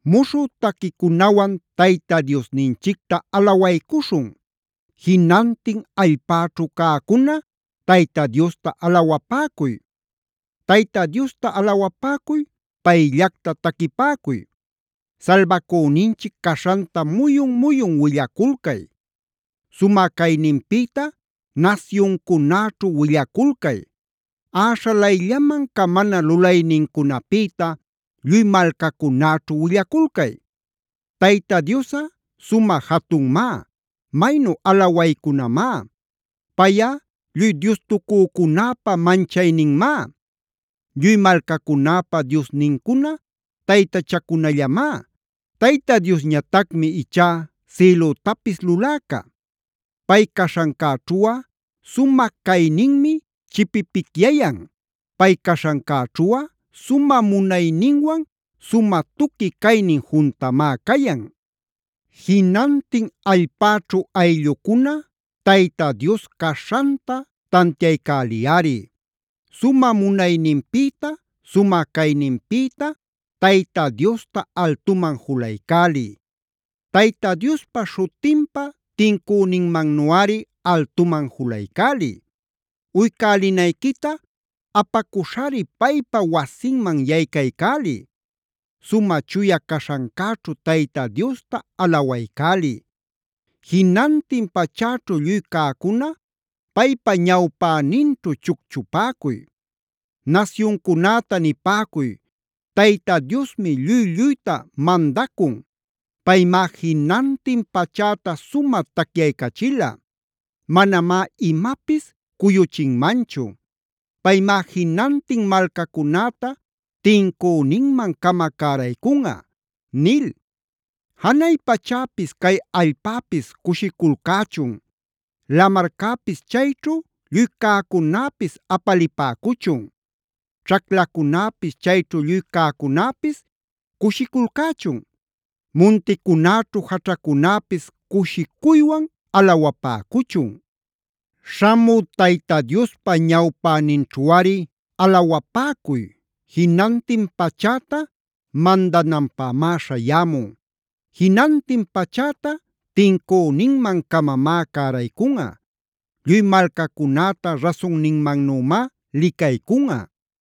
Muśhü taquicunawan Tayta Diosninchicta alawaycuśhun. Jinantin allpäćhu cäcuna Tayta Diosta alawapäcuy. Tayta Diosta alawapäcuy, payllacta taquipäcuy. Salbacüninchic caśhanta muyun-muyun willaculcay. Sumä cayninpïta nasyuncunäćhu willaculcay. Äśhalayllaman camana lulaynincunapïta lluy malcacunäćhu willaculcay. Tayta Diosꞌa sumä jatunmá; maynu alawaycunamá. Payꞌa lluy diostucücunäpa manchayninmá. Lluy malcacunäpa diosnincuna taytachacunallamá. Tayta Diosñatacmi ichá sïlütapis luläca. Pay caśhancäćhuꞌa sumä cayninmi chipipicyayan. Pay yaćhaśhancäćhuꞌa sumä munayninwan sumä tuqui caynin juntamá cayan. Jinantin allpäćhu ayllucuna Tayta Dios caśhanta tantiaycäliyꞌari. Sumä munayninpïta, sumä cayninpïta Tayta Diosta altuman julaycäliy. Tayta Diospa śhutinpa tincüninmannuꞌari altuman julaycäliy. Uycälinayquita apacuśhari paypa wasinman yaycaycäliy. Sumä chuya caśhancäćhu Tayta Diosta alawaycäliy.a Jinantin pachäćhu lluy cäcuna paypa ñawpäninćhu chucchupäcuy. Nasyuncunäta nipäcuy: “Tayta Diosmi lluy-lluyta mandacun. Paymá jinantin pachäta sumä tacyaycachila. Manamá imapis cuyuchinmanchu. Paymá jinantin malcacunäta tincüninman-cama cäraycunꞌa” nil. Janay pachäpis cay allpäpis cushiculcächun. Lamarcäpis chayćhu lluy cäcunäpis apalipäcuchun. Ćhaclacunäpis chayćhu lluy cäcunäpis cushiculcächun. Munticunäćhu jaćhacunäpis cushicuywan alawapäcuchun. Śhamü Tayta Diospa ñawpäninćhuꞌari alawapäcuy. Jinantin pachäta mandananpämá śhayämun. Jinantin pachäta tincüninman-camamá cäraycunꞌa. Lluy malcacunäta rasunninmannümá licaycunꞌa.